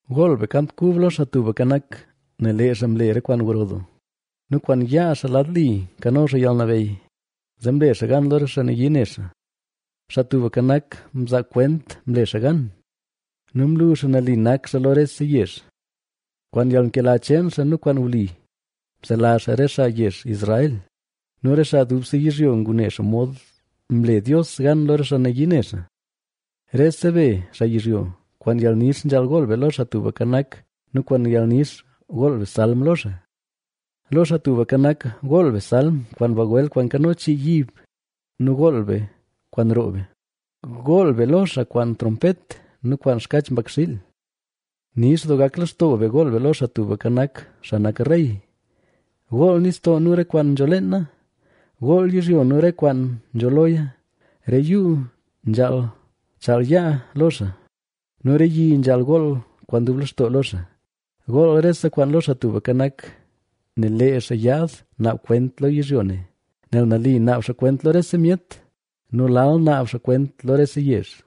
Gool be kant kub lo Xaa Tubka Nak, nel lee xaa mle re kwaan gro doo nu kwaan yaa xaa lad li nkano xaa yalnabeyy, zee mle xaa gan lo re xaa nayii ne xaa. Xaa Tubka Nak, mzaa kwent mle xaa gan nu mlu xaa nali nak xaa lo rese yezh. Kwaan yalnkela cheen xaa nu kwaan wli, Mselazh xaa re xaa yezh Israel, nel re xaa dubse yizhyo ngune xomod mle Dios gan lo re xaa nayii ne xaa. Rese be, xaa yizhyo, kwaan yalnix nzhaal gool be lo Xaa Tubka Nak; nu kwaan yalnix gool be salm lo xaa. Lo Xaa Tubka Nak, gool be salm kwaan bagwel kwaan nkano chii yib nu gool be kwaan roo be, gool be lo xaa kwaan trompet nu kwaan xkach mbakxiil. Nix doo gak lextoo be gool be lo Xaa Tubka Nak, xaa nak rey. Gool nistoo nu re kwaan nzho leena, gool yizhyo nu re kwaan nzho loya. Re yuu nzhaal chaal yaa lo xaa nu re yi nzhaal gool kwaan dub lextoo lo xaa. Gool rese kwaan lo Xaa Tubka Nak, nel lee xaa yaad naab kwent lo yizhyo ne, nel nali naab xaa kwent lo rese myet nu lal naab xaa kwent lo rese yezh.